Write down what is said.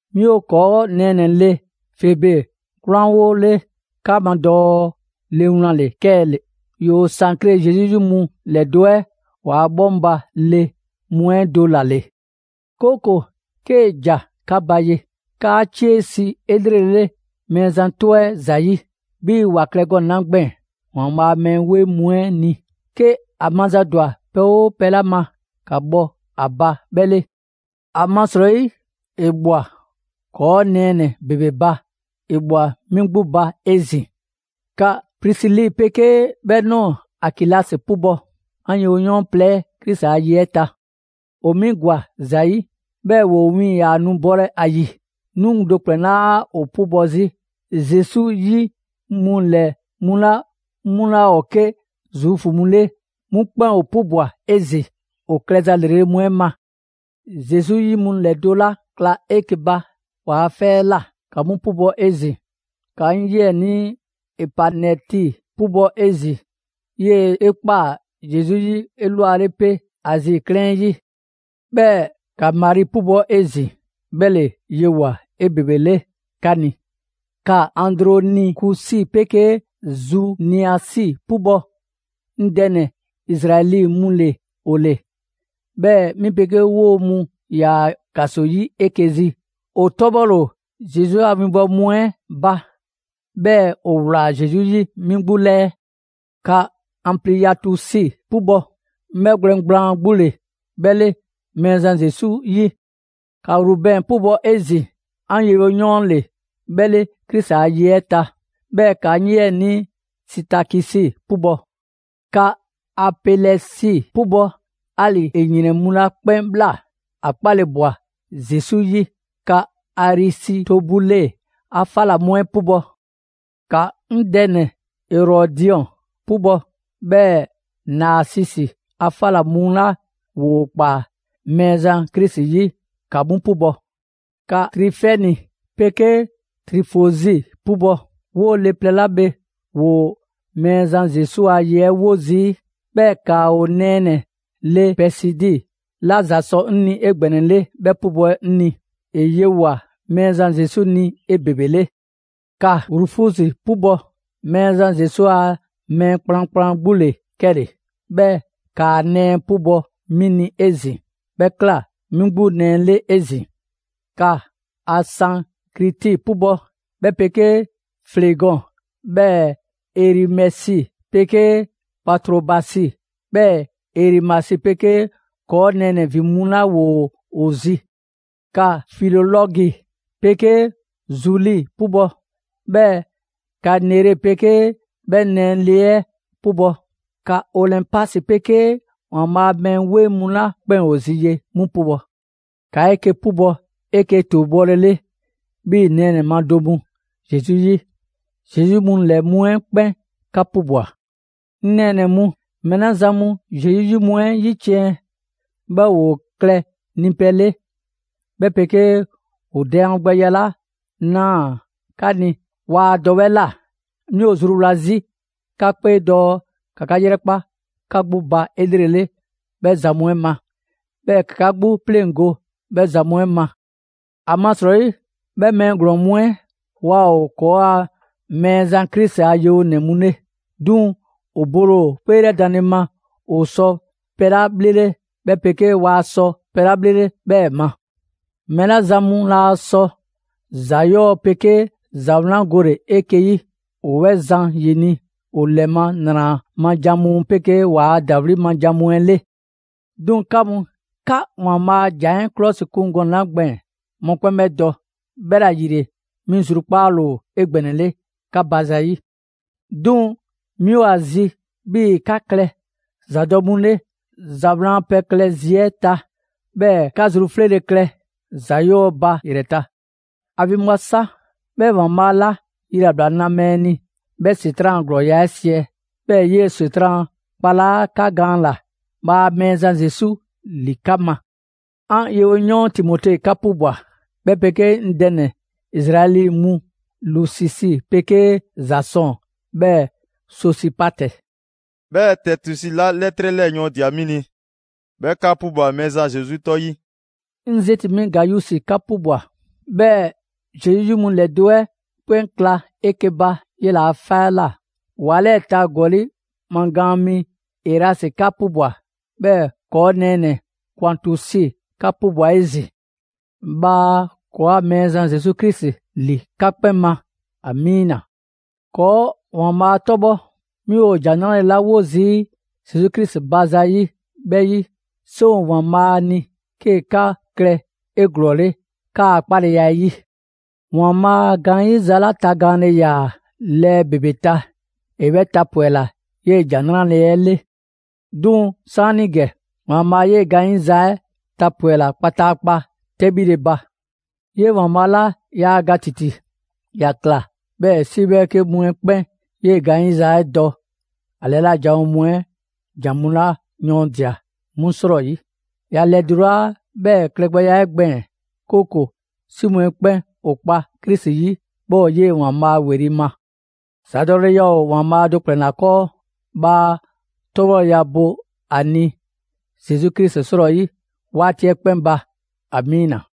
'Mi ‑o 'kɔɔ' nɛɛnɛ‑ le Febe 'kwlanwole 'ka ma dɔɔ le wlan ‑le 'kɛle‑. ‑Yoo Sankre Zesu 'yi mu ‑lɛdo' 'ɛ ‑waa' 'bhɔŋba‑ le mu 'ɛ do ‑la ‑le. 'Kooko‑ 'kee‑ ‑ja 'ka ba ye, ‑kaa 'cie si 'elrele Mɛɛzan 'tɔ 'ɛ ‑zayi', 'bhii‑ ‑wa klɛ gɔnɛ‑ 'la gbɛɛn‑ ‑Waanbhaa' a mɛɛ 'weŋ mu 'ɛ ni. 'Ke a mazadwa pɛ 'oo pɛ 'la ma, ‑ka bhɔ a ba 'bhɛ 'le. ‑Amasrɔyi ‑E ꞊bhwa ‑kɔɔ' nɛɛnɛ‑ ‑bebe ba, ‑e ꞊bhwa 'mi 'gbu ba 'ezin‑. ‑Ka Prisili 'pegee 'bhɛ ꞊nɔɔ Akilasi 'pubɔ‑; 'an yewoyɔɔn plɛ 'ɛ Krisi a ye 'ɛ ta. ‑O 'mi ‑gwa ‑za 'yi, 'bhɛɛ‑ 'woo‑ win ‑yaa nu bolɛ ‑a ‑yi. 'Mi do ‑kplɛn 'laa ‑o 'pubɔ‑ 'zi; Zesu 'yi mu 'lɛ mu 'la 'mu 'laa ‑o 'ke Zuufu mu 'le, 'mu 'kpɛn ‑o 'pubwa‑ 'ezin‑ ‑o klɛza ‑lrele' mu 'ɛ ma. Zesu 'yi mu ‑lɛdo' 'la kla 'eke‑ ba ‑waa 'fɛ 'ɛ ꞊la, 'ka 'mu 'pubɔ‑ 'ezin‑. ‑Ka 'ŋ 'yiɛnii Epanɛti 'pubɔ‑ 'ezin‑. 'Yele‑ 'e ꞊kpaa Zesu 'yi 'elwale 'pe Azi 'klɛɛn 'ɛ 'yi. 'Bhɛɛ‑ ‑ka Mari 'pubɔ‑ 'ezin‑, 'bhɛ ‑le yewoa꞊ 'ebebele 'ka ni. ‑Ka Andronikusi 'pegee Zuniasi 'pubɔ‑, 'ŋ dɛ ‑nɛ Izraɛli mu ‑le ‑o ‑le, 'bhɛɛ‑ 'mi 'pegee 'woo‑ mu ‑yaa ‑kaso 'yi 'eke‑ zi. ‑O 'tɔbhɔle ‑o Zesu a 'winbɔwo mu 'ɛ ba, 'bhɛɛ‑ ‑o ꞊wlaa Zesu 'yi 'mi 'gbu 'lɛɛ. ‑Ka Anpliyatusi 'pubɔ‑, 'ŋ 'bhɛgwlɛn‑ gblaan 'gbu ‑le 'bhɛ 'le Mɛɛzan Zesu 'yi. ‑Ka Rubɛn 'pubɔ‑ 'ezin‑, 'ŋ yewoyɔɔn ‑le 'bhɛ 'le Krisi a ye 'ɛ ta. 'Bhɛɛ‑ ‑ka 'ŋ 'yiɛnii Sitakisi 'pubɔ‑. ‑Ka Apɛlɛsi 'pubɔ‑; 'ali‑ ‑e ‑yrɛn mu 'la 'kpɛn ꞊bhla, ‑a 'kpale‑ ꞊bwa Zesu 'yi. ‑Ka Arisitobule a 'fa ꞊la mu 'ɛ 'pubɔ‑. ‑Ka 'ŋ dɛ ‑nɛ Erɔdiɔn 'pubɔ‑. 'Bhɛɛ‑ Naasisi a 'fa ꞊la mu 'la ‑woo ꞊kpaa Mɛɛzan Krisi 'yi, ‑ka 'mu 'pubɔ‑. ‑Ka Trifɛni 'pegee Trifozi 'pubɔ‑; 'woo‑ le plɛ 'la bhe ‑woo Mɛɛzan Zesu a ye 'ɛ 'wo zii'. 'Bhɛɛ‑ ‑ka 'o nɛɛnɛ‑ le Pɛɛsidi 'la ‑za sɔ 'ŋ ni 'egbɛnɛle 'bhɛ 'pubɔ‑ 'ŋ ni; ‑e yewoa꞊ Mɛɛzan Zesu ni 'ebebele. ‑Ka Rufusi 'pubɔ‑; Mɛɛzan Zesu a mɛɛ kplankplan 'gbu ‑le 'kɛle‑. 'Bhɛɛ‑ ‑kaa nɛɛ 'pubɔ‑ 'mi ni 'ezin‑; 'bhɛ ꞊kla 'mi 'gbu nɛɛ 'le 'ezin. ‑Ka Asɛnkriti 'pubɔ‑, 'bhɛ 'pegee Flegɔn, 'bhɛɛ‑ Erimɛsi 'pegee Patrobasi, 'bhɛɛ‑ Erimasi 'pegee ‑kɔɔ' nɛɛnɛ‑ ‑vin mu 'la ‑woo ‑o zi. ‑Ka Filolɔgi 'pegee Zuli 'pubɔ‑; 'bhɛɛ‑ ‑ka Nere 'pegee 'bhɛ nɛɛnɛ‑ le 'ɛ 'pubɔ‑. ‑Ka Olɛnpasi 'pegee ‑Waanbhaa' a mɛɛ 'weŋ mu 'la 'kpɛn ‑o zi ye 'mu 'pubɔ‑. ‑Ka 'eke‑ 'pubɔ‑ 'eke‑ ‑tuubɔlele 'bhii‑ ‑ nɛɛnɛ‑ ma do mu Zesu 'yi. Zesu 'yi mu ‑lɛ mu 'ɛ 'kpɛn 'ka 'pubwa‑. 'Ŋ nɛɛnɛ‑ mu, mɛɛ 'la zan mu Zesu 'yi mu 'ɛ 'yiciɛn‑, 'bhɛɛ‑ ‑woo klɛ nipɛ 'le, 'bhɛ 'pegee 'o daangbɛya 'la ꞊naa 'ka ni waa dɔ 'bhɛ ꞊la, 'mi ‑o zruwla 'zi 'ka 'kpee dɔɔ ‑ka 'ka 'yrɛkpa 'ka 'gbu ba 'elrele 'bhɛ zan mu 'ɛ ma. 'Bhɛɛ‑ ‑ka 'ka 'gbu 'pleŋgo‑ 'bhɛ zan mu 'ɛ ma. ‑Amasrɔyi, 'bhɛ mɛɛ ‑glɔɔn mu 'ɛ, waa ‑o ‑kɔɔa' Mɛɛzan Krisi a yewonɛ mu 'le, 'duŋ‑ ‑o bole ‑o 'kpeelɛdanle ma ‑o sɔ pɛ 'la 'bhlele, 'bhɛ 'pegee waa sɔ pɛ 'la 'bhlele 'bhɛɛ‑ ma. Mɛɛ 'la zan mu laa sɔ ‑za 'yɔɔ‑ 'pegee ‑za 'wlan gole‑ 'eke‑ 'yi, ‑o 'bhɛ zan ‑yini' ‑o ‑lɛ ma ‑nra ma jan mu 'ɛ 'pegee waa ‑dawli' ma jan mu 'ɛ 'le. 'Duŋ‑ 'ka mu, 'ka ‑Waanbhaa' a ‑jan 'ɛ 'klɔsikun gɔnɛ‑ 'la gbɛɛn‑, mɔkpɛn' 'bhɛ dɔ. 'Bhɛla‑ ‑yile, 'mi zrukpaale ‑o 'egbɛnɛle 'ka ba zayi'. 'Duŋ‑ 'mi ‑o ‑a zi 'bhii‑ 'ka klɛ ‑zadɔ' mu 'le ‑za 'wlan a pɛ klɛ zi 'ɛ ta, 'bhɛɛ‑ 'ka zru 'fleele‑ klɛ ‑za 'yɔɔ‑ ba ‑yrɛ ta. ‑A ‑vinbwa sa, 'bhɛɛ‑ ‑Waanbhaa' 'la yilabla na mɛɛ ni 'bhɛ ‑Setran' a ‑glɔɔya' 'ɛ siɛ, 'bhɛɛ‑ ‑e 'yee‑ ‑Setran' kpalaa' 'ka gaan ꞊la. Bhaa Mɛɛzan Zesu ‑li 'ka ma! 'Ŋ yewoyɔɔn Timote 'ka 'pubwa‑; 'bhɛ 'pegee 'ŋ dɛ ‑nɛ Izraɛli mu Lusisi 'pegee Zasɔn, 'bhɛɛ‑ Sosipatɛ. 'Bhɛɛ‑ Tɛɛtusi 'la 'lɛtrɛ 'lɛɛ‑ yɔɔndia‑ 'mi ni, 'bhɛ 'ka 'pubwa‑ Mɛɛzan Zesu 'tɔ 'yi. 'Ŋ zeti‑ mi Gayusi 'ka 'pubwa‑. 'Bhɛɛ‑ Zesu 'yi mu ‑lɛdo' 'ɛ 'kpɛn kla 'eke‑ ba 'yela‑ 'fɛ 'ɛ ꞊la. ‑Wa 'lɛɛ‑ ta ‑gɔli' magaan mi Erasi 'ka 'pubwa‑. 'Bhɛɛ‑ ‑kɔɔ' nɛɛnɛ‑ Kwaatusi 'ka 'pubwa‑ 'ezin‑. [Bhaa ‑kɔɔa' Mɛɛzan Zesu Krisi ‑li 'ka 'kpɛn ma! Amiina.] ‑Kɔɔ' Waanbhaa' 'tɔbhɔ! 'Mi ‑o ‑Jan 'Nrale‑ 'la 'wo zii' Zesu Krisi ba zayi' 'bhɛ 'yi, 'seŋ ‑o ‑Waanbhaa' ni 'kee‑ 'ka klɛ 'eglɔɔle 'kaa‑ 'kpaleya 'ɛ 'yi. ‑Waanbhaa' a gaanyiza 'la tagaanle ‑yaa lɛɛ ‑bebe ta, ‑e 'bhɛ tapwɛla 'yee‑ ‑Jan 'Nrale‑ 'ɛ 'le. 'Duŋ‑ 'saanigɛ, ‑Waanbhaa' 'yee‑ gaanyiza 'ɛ tapwɛla kpataakpa 'tɛbhile ba. 'Yee‑ ‑Waanbhaa' 'la yaa ga ‑titi, ‑ya ꞊kla 'bhɛɛ‑ 'si 'bhɛɛke mu 'ɛ 'kpɛn 'yee‑ gaanyiza 'ɛ dɔ ‑a ‑lɛla' janwo mu 'ɛ ‑jan mu 'la yɔɔndia‑ 'mu 'srɔyi. ‑Ya ‑lɛdulaa 'bhɛɛ‑ klɛgbɛya 'ɛ gbɛɛn‑, 'kooko‑ 'si mu 'ɛ 'kpɛn ‑o kpa Krisi 'yi, 'bhɛɛ‑ ‑o 'yee‑ ‑Waanbhaa' ‑weli' ma. ‑Zadɔleya ‑o ‑Waanbhaa' do ‑kplɛn ‑la 'kɔɔ, bhaa 'tɔbhɔleya bo a ni Zesu Krisi 'srɔyi 'waati 'ɛ 'kpɛn ba! ‑Amiina!